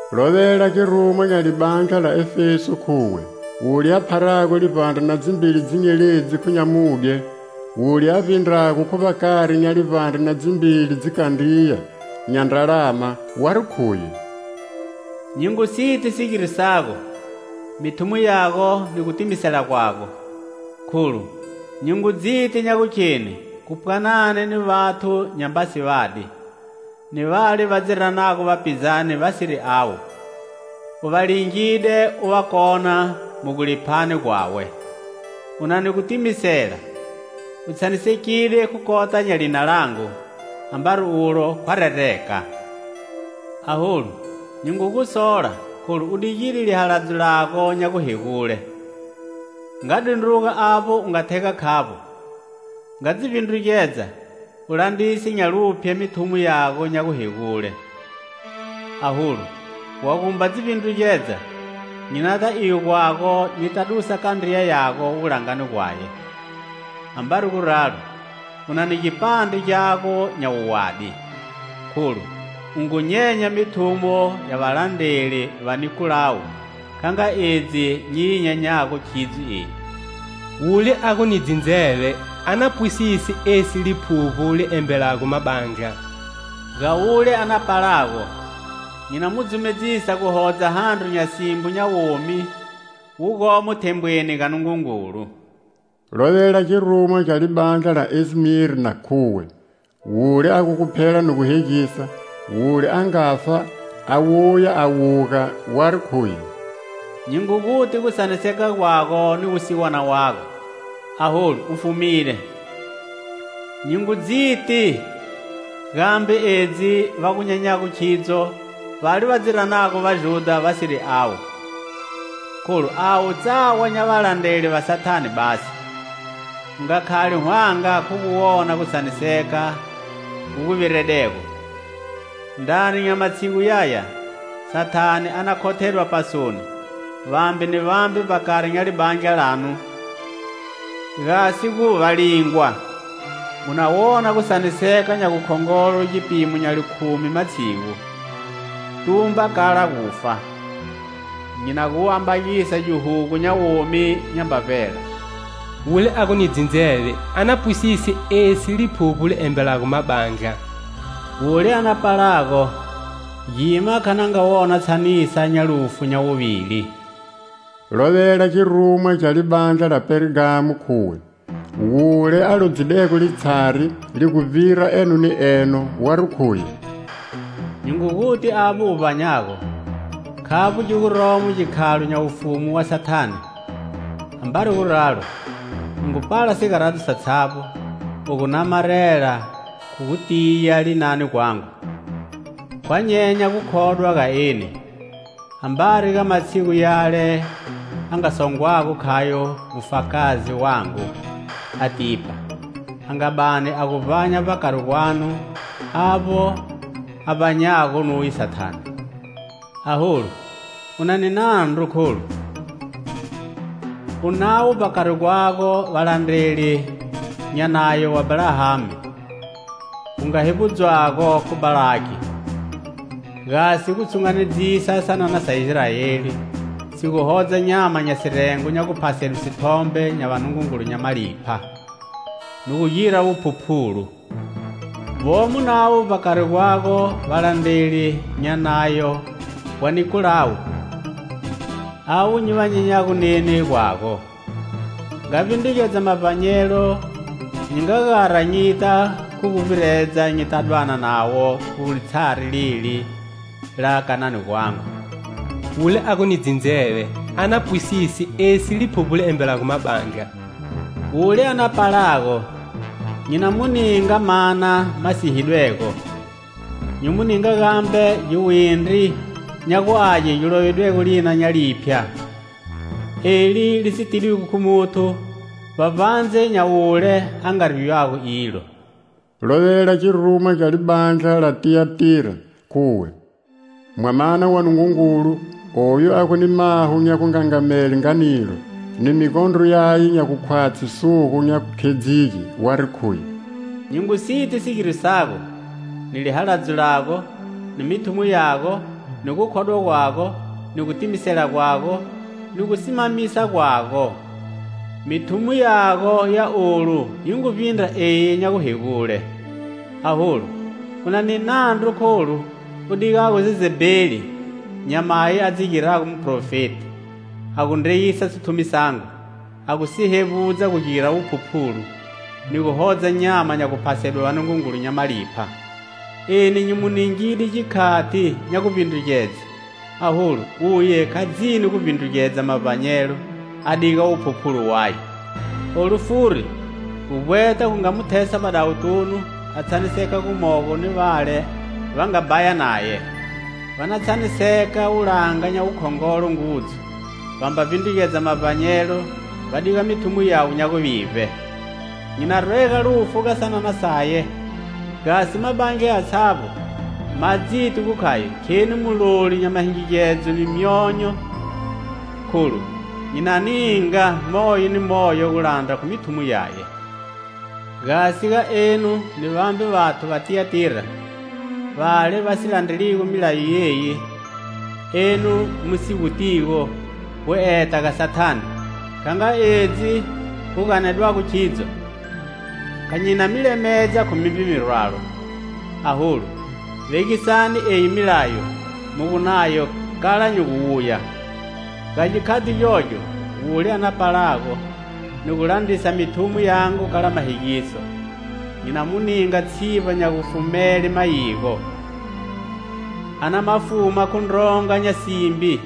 "Lovela girumwa gya libandla la Efeso khuwe:"Wule a pharago livbandre na dzimbili dzinyeledzi khu nyamudye; wule a vbindrago khu vbakari nya livbandre na dzimbili dzikandriya nya ndralama, wari khuye: Nyi ngu siti sigiro sago, mithumo yago ni gutimisela gwago, kholu nyi ngu dziti nya gukheni khu pwanani ni vathu nyamba si vadi; ni vale va dzi ranago vapizani vasiri u va, u va lingide, uva kona mu guliphani gwawe. "U nani gutimisela, u tshanisekide khu kota nya lina langu, ambari ulo khwa rereka. Aholu, nyi ngu gusola kholu u digile lihaladzo lago nya guhegule. Nga dundruga avbo u nga thega khavbo; Nga dzi vbindrugedza, u landrisa nya luphye mithumo yago nya guhegule. Aholu, wa gumba dzi vbindrugedza, nyi nata iyo gwago nyita dusa kandriya yago wulangani gwaye. "Ambari guralo, unani gipandre gyago nya wuwadi, kholu, u ngu nyenya mithumo ya valandreli va Nikolawu, kha nga edzi nyi yi nyenyago khidzo eni. "Wule a gu ni dzindzeve a na pwisise esi Liphuvbo li embelago mabandla. Ga wule a na palago, nyi na mu dzumedzisa guhodza handro nya simbo nya womi wu gomo thembweni ga Nungungulu." "Lovela girumwa gya libandla la Esmirna, khuwe: "Wule a gu guphela ni guhegisa; wule a ngafa a wuya a wuga, wari khuye: Nyi ngu guti gutshaniseka gwago ni wusiwana wago, aholu u fumide. Nyi ngu dziti gambe edzi va gu nyenyago khidzo vale va dzi ranago Vajudha vasiri avo, kholu avo tsawa nya valandreli va Sathane basi. U nga khali hwanga khu gu wona gutshaniseka gu gu viredego. Ndrani nya matshigu yaya, Sathane a na khothela pasoni vambe ni vambe vbakari nya libandla lanu, gasi gu va lingwa. Muna wona gutshaniseka nya gukhongolo gipimo nya likhumi matshigu. Tumba kala gufa, nyi na gu ambagisa gihugu nya womi nyamba bela. "Wule a gu ni dzindzeve a na pwisise esi Liphuvbo li embelago mabandla: wule a na palago gima kha na nga wona tshanisa nya lufu nya wuvili." "Lovela Girumwa gya libandla la Pergamo khuwe: "Wule a lodzidego litshari li gu vbira eno ni eno, wari khuye: Nyi ngu guti avbo u vbanyago, khavbo gi guromo gikhalo nya wufumu wa Sathane.Ambari guralo, u ngu pala sigaradzo satshavbo, u gu namarela, khu gutiya, linani gwangu. Khwa nyenya gukhodwa ga eni. Ambari ga matshigu yale a nga songwago khayo mufakazi wangu Antipa a nga bani a gu vbanya vbakari gwanu avbo a vbanyago nuye Sathane. Aholu, u na ni nandru kholu: u navo vbakari gwago valandreli nya nayo wa Balahami wu nga hevbudzwago khu Balahaki gasi gu tshunganedzisa sanana sa Israeli si gu hodza nyama nya sirengo nya guphasedwe sithombe nya vanungungulu nya malipha, ni gu gira wuphuphulu. Vomo navo vbakari gwago valandreli nya nayo wa Nikolawu avo ni va nyenyago neni gwago. Nga vbindrugedza mavbanyelo: nyi nga gara nyita khu guvbiredza nyita dwana navo khu litshari leli la kanani gwangu. "Wule a gu ni dzindzeve a na pwisise esi Liphuvbo li embelago mabandla: wule a na palago nyi na mu ninga mana ma sihidwego. Nyi mu ninga gambe giwindri nya guage gilovidwego lina nya liphya, eli li si tidwigo khu muthu vbavbandze nya wule a nga riywago ilo." "Lovela girumwa gya libandla la Tiyatira khuwe:"Mwamana wa Nungungulu, oyu a gu ni maho nya gugungangamele nga nilo, ni migondro yaye nya gukhwatshi sugu nya gukhedzige, wari khuye: Nyi ngu siti sigiro sago, ni lihaladzo lago, ni mithumo yago, ni gukhodwa gwago, ni gutimisela gwago, ni gusimamisa gwago; mithumo yago ya olu yi ngu vbindra eyi nya guhegule. Aholu, u na ni nandru kholu u digago Jezebeli, nyamayi a dzi girago muhprofeti, a gu ndreyisa sithumi sangu, a gu si hevbudza gu gira wuphuphulu, ni gu hodza nyama nya guphasedwe vanungungulu nya malipha. Eni nyi mu ningide gikhati nya guvbindrugedze, aholu, uye kha dzini gu vbindrugedza mavbanyelo a diga wuphuphulu waye. Olu furi guvbweta gu nga mu thesa vbadawutunu a tshaniseka gumogo ni vale va nga bhaya naye, va na tshaniseka wulanga nya wukhongolo ngudzu va mba vbindrugedza mavbanyelo va diga mithumo yawe nya guvivbe. Nyi na rwega lufu ga sanana saye gasi mabandla yatshavbo ma dziti gu khayo kheni muloli nya mahingigedzo ni myonyo, kholu nyi na ninga moyo ni moyo gu landra khu mithumo yaye. "Gasi ga enu ni vambe vathu va Tiyatira vale va si landreligo milayo yeyi, enu mu si gutigo 'Gu eta ga Sathane' (kha nga edzi gu ganedwago khidzo) kha nyi na mi lemedza khu mimbe mirwalo. Aholu, vegisani eyi milayo mu gu nayo kala nyi gu wuya. Ga gikhati gyogyo wule a na palago ni gu landrisa mithumo yangu kala mahegiso, nyi na mu ninga tshivba nya gufumele mayigo. A na ma fuma khu ndronga nya simbi,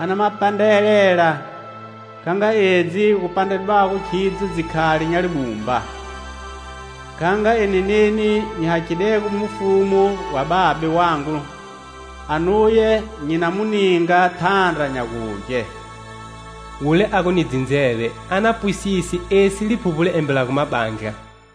a na ma pandrelela kha nga edzi gu pandredwago khidzo dzikhali nya libumba. Kha nga eni neni nyi hakhidego mufumu wa Babe wangu anuye nyi na mu ninga thandra nya gugye. "Wule a gu ni dzindzeve a na pwisise esi Liphuvbo li embelago mabandla."